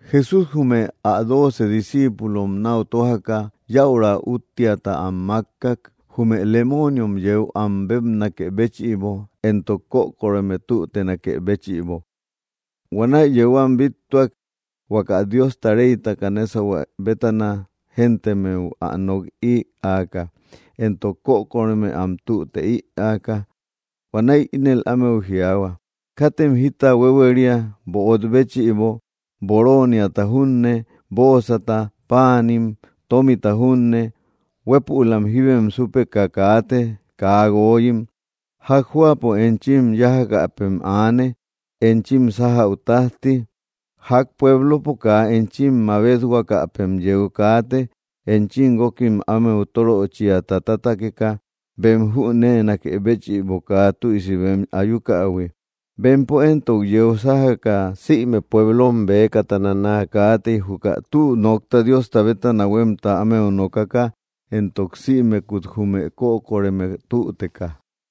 Jesús jume ä dooce discíipulom náu tójaka, yäura úttiata am mákkak, jume lemooniom yeu am bébnakë béchïbo, éntok kökoreme tütenakë béchïbo. Huanäi yeu am bíttuak, huaka Diosta reytaka nésahue bétana géntemmeu am nok ïaaka, éntok kökoreme am tüte ïaaka. Huanäi ínel ámeu jiaahua: —Katem jita huéhueria böot béchïbo, borooniata junne, bóosata, páanim, tómita junne. Huépülam jíbem súpeka kaate, kaa guooyim. Ják jóapo enchim yájakäpem aane, enchim sájäu tájti. Ják pueblopo kaa enchim mabethuakäpem yeu kaate, enchim guókim ámeu tóröchiata tátakeka, bem jüneenakë béchïbo kaa tüisi bem ayukähui. Bempo éntok yeu sájaka, sïme pueblom bëkatana naa kaatey, juka tü nokta Diosta bétana huémta ámeu nokaka éntok sïmekut jume kökoreme tüteka.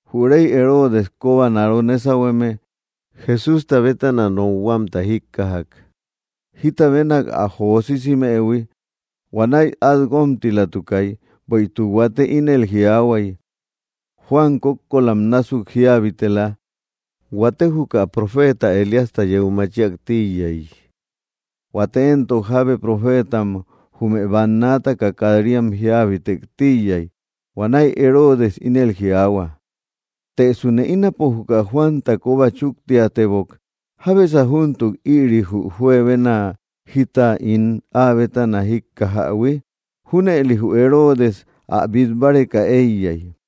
Jü rey Heroodes kobanaro nésahueme Jesústa bétana nokhuamta jíkkajak, jita benak ä jo sisimëhui. Huanäi át guómtilatukay. Bueïtuk huate ínel jiaahuay: “Juan kókkolam násuk jíabitela.” Huate, juka profeeta Elíasta yeu machiak tíiyay. Huate éntok, jábe profeetam jume bannaataka kat‑riam jíabitek tíiyay. Huanäi Heroodes ínel jiaahua: —Tësune ínapo juka Juanta kóba chúktiatebok. ¿Jábesa júntuk ïri jü juebena jita ín áa bétana jíkkajähui? Júnëli jü Heroodes ä bít báreka éiyay.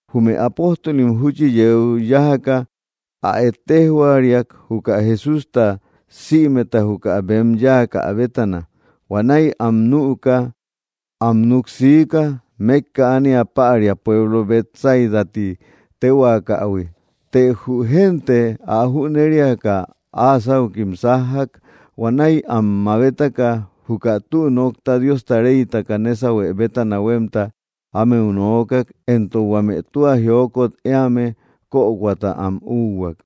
Jume apóstolim júchi yeu yájaka ä ejtejhuariak juka Jesústa sïmeta juka bem yáakä bétana. Huanäi am nüka, am núk siika, mékka ánia päria pueblo Betsaida ti téhuaakähui. Të jü génte ä jüneriaka, áa sáukim sájjak. Huanäi am mabetaka juka tü nokta Diosta reytaka nésahue bétana huémta ámeu nookak, éntok huame tua jiokot éame kökoata am úhuak.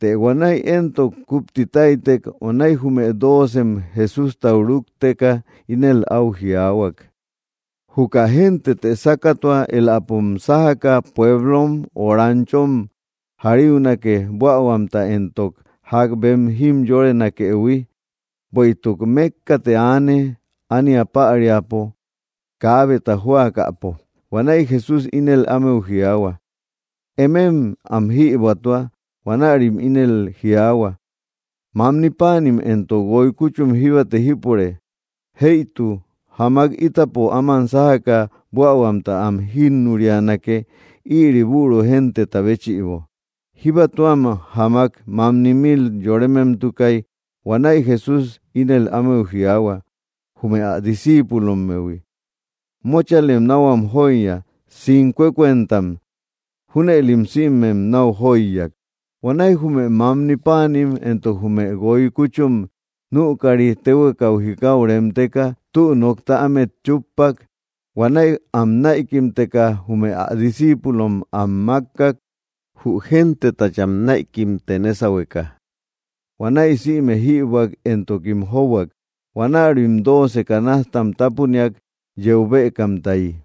Të huanäi éntok kúpti táytek. Huanäi jume doocem Jesústau rúkteka, ínel áu jiaahuak: —Juka géntetë sákatua. Éläpom sájaka pueblom o ranchom jariunake, buähuamta éntok ják bem jimyorenakëhui. Bueïtuk mékkate aane, ánia päriapo, kaabeta jóakäpo. Huanäi Jesús ínel ámeu jiaahua: —Emem am jïbuätua. Huanärim ínel jiaahua: —Mamni páanim éntok guoy kúchum jíbate jípure. Jëitu, jamak ítapo áman sájaka buähuamta am jínnurianake, ïri büru genteta béchïbo. Jíba tuam jamak mamni mil yorememtukay. Huanäi Jesús ínel ámeu jiaahua jume ä discíipulommehui: —Móchalem náu am jóiya, sincuecuentam. Júnëlim sïmem náu jóiyak. Huanäi jume mamni páanim éntok jume guoy kúchum nükari, téhuekau jikau remteka, tü nokta ámet chúppak. Huanäi am näikimteka, jume ä discíipulom am mákkak, jü gentetacham näikimte nésahueka. Huanäi sïme jïbuäk, éntokim jóbuak. Huanärim dooce canastam tápuniak, yeu bëkamtayi.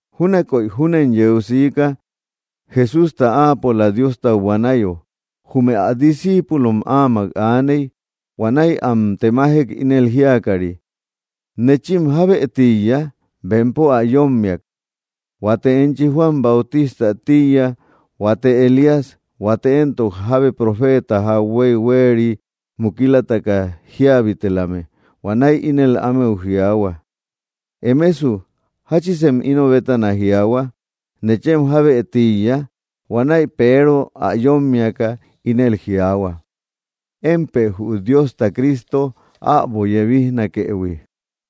Júnakoy júnen yeu siika. Jesústa áapola Diostau buanayo, jume ä discíipulom áamak aaney. Huanäi am temajek, ínel jíakari: —¿Nechim jábë tíiya? Bempo ä yómmiak: —Huate enchi Juan Bautistä tíiya. Huate, Elías. Huate éntok, jábe profeeta jauhuey huéria mukilataka jíabitelame. Huanäi ínel ámeu jiaahua: —Emesu, ¿jáchisem ino bétana jiaahua? ¿Nechem jábë tíiya? Huanäi Peero ä yómmiaka, ínel jiaahua: —Émpë jü Diosta Cristo äbo yebisnakëhui.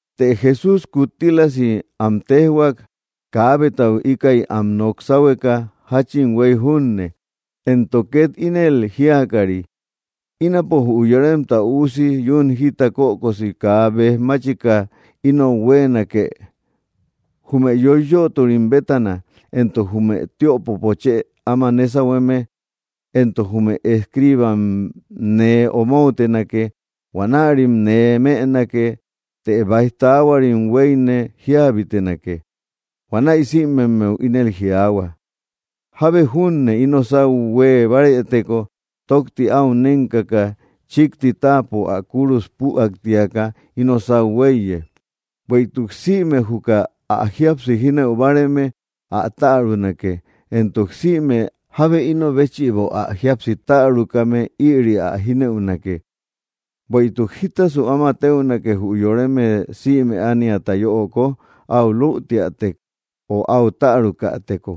Të Jesús kúttilasi am téjhuak, kaabetau íkäi am nok sáhueka jáchin huéy junne, éntok két ínel jiakari: —Ínapo jü Yoremta Üusi yún jita kökosi kaa béj máchika inou huéenake. Jume yoiyöturim bétana, éntok jume tiöpopo chë áma nésahueme, éntok jume escribam nee omoutenake. Huanärim nee mënake, të báij taahuarim huéyne jíabitenake. Huanäi sïmemmeu ínel jiaahua: —Jábe júne ino sáu huée bárëteko, tókti áu nénkaka, chíkti táapo ä kúrus püaktiaka, ino sáu huéiye. Bueïtuk sïme juka ä jíapsi jínëu báareme, ä tärunake, éntok sïme jábe ino béchïbo ä jíapsi tärukame, ïri ä jínëunake. ¿Bueïtuk jítasu áma téunake jü yoreme sïme ániata yöoko, áu lütiätek, o áu tärukäteko?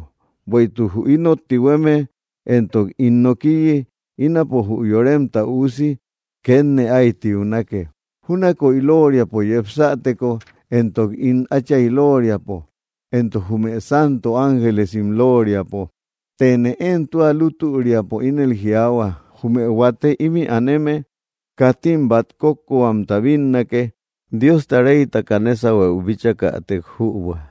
Bueïtuk jü inot tihueme éntok ín nokiyi, ínapo jü Yoremta Üusi kétne ái tiunake, júnakoy lóoriapo yepsateko, éntok ín Átchay lóoriapo, éntok jume santo ángelesim lóoriapo. Tëne én tua lútüriapo ínel jiaahua, jume huate imï aneme, katim bát kókkohuamta bínnake, Diosta reytaka nésahueu bíchäkatek júbua.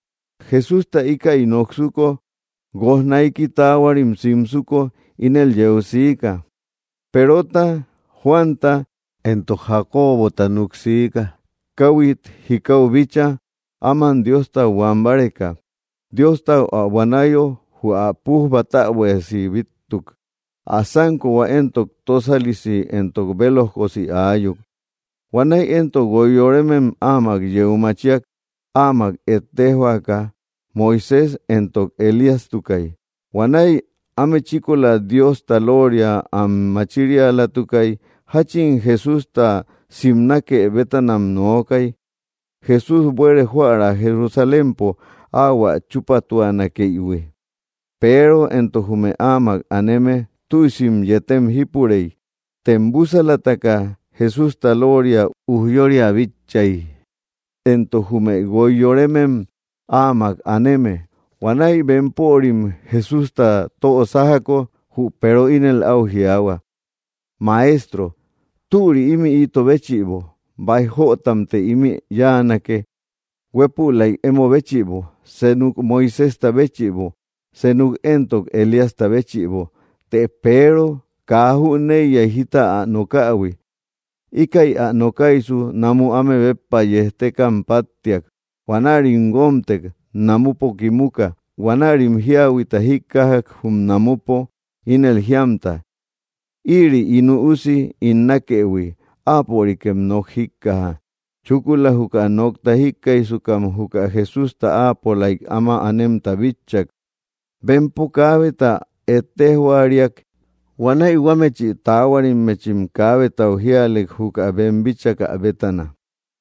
Jesústa íkäi noksuko, guoj naiki taahuarim simsuko, ínel yeu siika. Perota, Juanta éntok Jacobota núk siika, káhuit jikau bíchaa, áman Diostau buan báreka. Diostau ä buanayo, jü ä pujba täbuiasi bíttuk. Ä sánkohua éntok tósalisi éntok bélojkosi aayuk. Huanäi éntok guoy yoremem áma yeu machiak, áamak ejtejhuaka. Moisés éntok Elíastukay. Huanäi áme chíkola Diosta lóoria am machirialatukay. Jachin Jesústa simnake bétanam nookay, Jésús buere joära Jerusalémpo ahuä chupátuanakëihui. Peero éntok jume áamak aneme, tüisim yetem jípurey. Tem búsalataka, Jesústa lóoria ujyória bitchay, éntok jume guoy yoremem áamak aneme. Huanäi bempörim Jesústa tö sájako, jü Peero ínel áu jiaahua: —Maestro, ¡türi ímï ito béchïbo! Báij jötamte ímï cháanake, huépülaik emo béchïbo, senuk Moiséjta béchïbo, senuk éntok Elíasta béchïbo. Të Peero kaa jüneiyay jita ä nokähui. Íkäi ä nokaysu, namu áme béppa yéjtekam páttiak. Huanärim guómtek, namupo kimuka. Huanärim jiahuita jíkkajak jum namupo, ínel jíamta: —Ïri ín Üusi ín nákëhui; áapörikem nok jíkkaja. Chúkula juka nokta jíkkaijsukam juka Jesústa áapolaik áma anemta bitchak. Bempo kaabeta ejtejhuaariak. Huanäi huámechi taahuarimmechim kaabetau jíalek juka bem bíchakä bétana.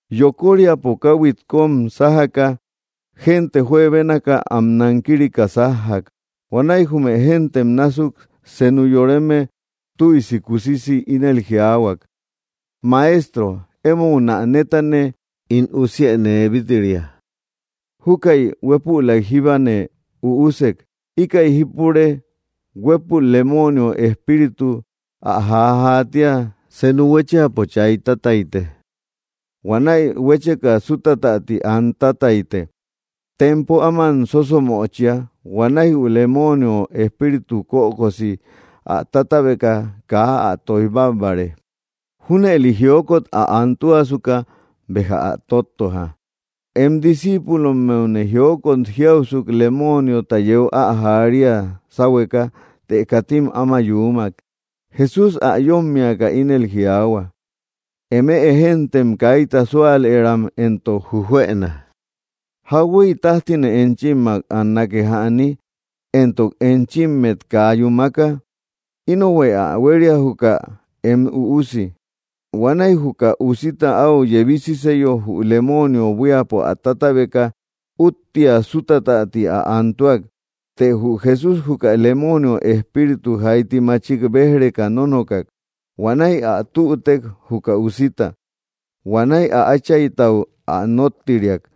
Yokoríapo, káhuit kóm sájaka, génte juebénaka am nankirika sajjak. Huanäi jume géntem násuk senu yoreme tüisi kusisi ínel jiaahuak: —Maestro, émounä nétane ín usië nee bít‑ria. Júkäi huépülaik jíbane üusek. Íkäi jípure, huépul lemoonio espíritu ä jaajaatia. Senu huéchiapo chay tátayte. Huanäi huécheka sútatäti an tátayte. Tempo áman sósomöchia. Huanäi jü lemoonio espíritu kökosi ä tátabeka kaa ä tóij bábbare. Júnëli jiokot ä antuasuka béja ä tóttoja. Em discíipulommeune jiokot jiausuk lemoniota yeu ä jaaria sáhueka, të katim áma yuumak. Jesús ä yómmiaka, ínel jiaahua: —¡Eme géntem kaita súalëram éntok jujuëna! ¿Jauhuey tájtine enchimmak annake jäni, éntok enchimmet kaa yúmaka? Inohuë ä huéria juka em üusi. Huanäi juka usita áu yebisiseyo, jü lemoonio buíapo ä tátabeka, úttia sútatäti ä antuak. Të jü Jesús juka lemoonio espíritu jaiti machik béj‑reka nónokak. Huanäi ä tütek juka usita. Huanäi ä áchaytau ä nóttiriak.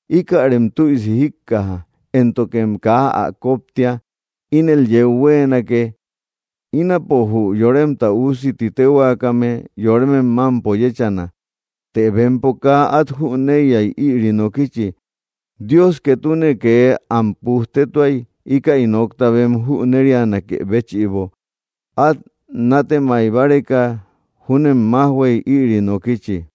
—Íkärem tüisi jíkkaja, éntokem kaa ä koptia. Ínel yeu huéenake: ínapo, jü Yoremta Üusi ti téhuaakame, yoremem mámpo yéchana. Të bempo kaa át jüneiyay, ïri nokichi. Dios ketune kee am pujtetuay, íkäi nokta bem jünerianakë béchïbo; át nátemay báreka júnem májhuey ïri nokichi.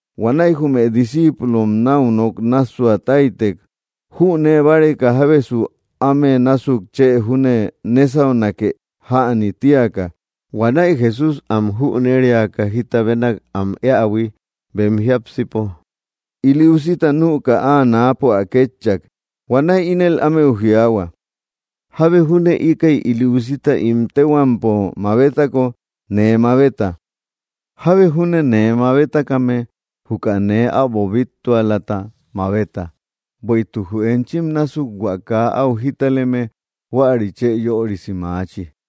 Huanäi jume discíipulom náu nok nássua táytek, jünee báreka jábesu áme násuk chë júne nésaunake jäni tíaka. Huanäi Jesús am jüneriaka jita benak am éähui bem jiápsipo, ili usita nüka, áa náapo ä kétchak. Huanäi ínel ámeu jiaahua: —Jábe júne íkäi ili usita ín téhuampo mabetako, nee mabeta; jábe júne nee mabetakame, juka nee äbo bíttualata mabeta. Bueïtuk jü enchim násuk hua kaa áu jitaleme, huäri chë yörisi maachi.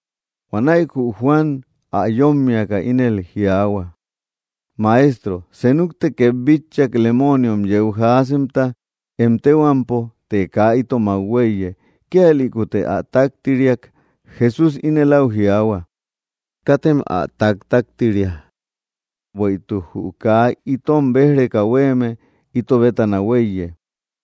Huanäi jü Juan ä yómmiaka, ínel jiaahua: —Maestro, senukte két bitchak, lemooniom yeu jaasemta em téhuampo. Të kaa itomak huéiye; kíalïkute ä táktiriak. Jesús ínel áu jiaahua: —Katem ä taktaktiria; bueïtuk jü kaa itom béj‑reka huéeme, ito bétana huéiye.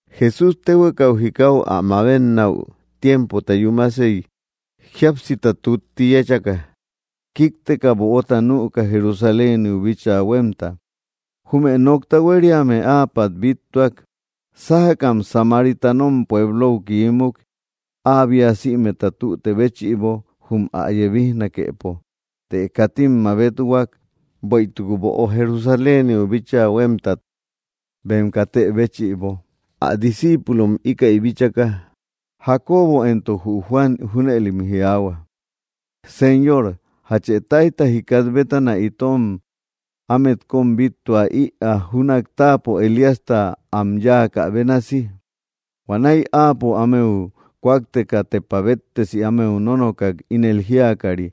Jesús, téhuekau jikau ä mabennäu tiempota yúmasey, jíapsita tutti yéchaka, kíkteka böota nüka Jerusaléniu bíchaa huémta. Jume nokta huériame áapat bíttuak, sájakam Samaritanom pueblou kiímuk, áa bia sïmeta tüte béchïbo jum ä yebijnakepo. Të katim mabethuak, bueïtuk böo Jerusaléniu bíchaa huémtat bem katë béchïbo. Ä discíipulom íkäi bíchaka, Jacobo éntok jü Juan, junëlim jiaahua: —Señor, ¿jache táijta jikat bétana itom ámet kóm bíttua ïaa, júnak táapo Elíasta am yáakä bénasi? Huanäi áapo ámeu kúakteka, tepa béttesi ámeu nónokak, ínel jíakari: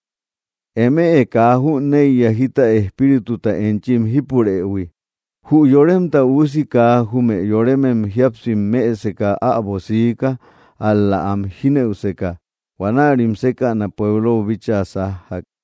—Eme kaa jüneiya jita espírituta enchim jípurëhui. Jü Yoremta Üusi kaa jume yorem jíapsim mëseka äbo siika, ál‑la am jínëuseka. Huanärim sékäna pueblou bíchaa sájjak.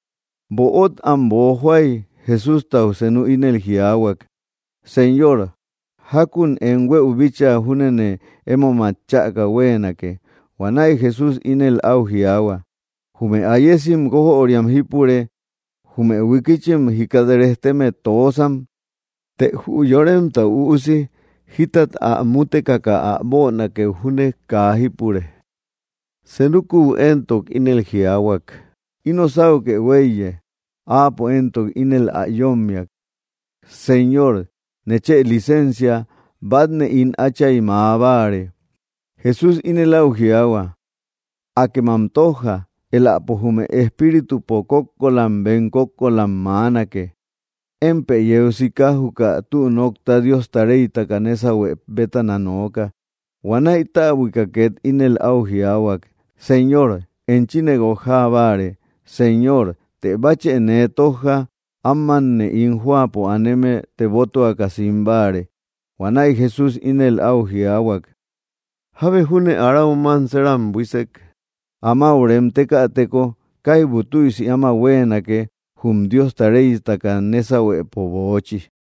Böot am boojoay, Jesústau senu ínel áu jiaahuak: —Señor, jákun em huëu bíchaa júnene emót chäka huéenake. Huanäi Jesús ínel áu jiaahua: —Jume ayesim guojöriam jípure, jume huikichim jikat rejteme, toosam; të jü Yoremta Üusi jitat ä mutekaka ä bönakeu júne kaa jípure. Senukuu éntok ínel jiaahuak: —Ino sáukë huéiye. Áapo éntok ínel ä yómmia: —Señor, nechë licensia bátne ín átchay mäa báare. Jesús ínel áu jiaahua: —Akë am tójja; éläpo jume espíritupo kókkolam bem kókkolam maanake. Émpë yeu sika juka tü nokta Diosta reytaka nésahue bétana nooka. Huanäi täbuika két ínel áu jiaahuak: —Señor, enchine guojaa báare, Señor, të báchë nee tójja amanne ín jóapo aneme tebotuaka sim báare. Huanäi Jesús ínel áu jiaahuak: —Jábe júne arau manseeram buísek, amáu remtekäteko, kaibu tüisi áma huéenake jum Diosta reytaka nésahuepo böochi.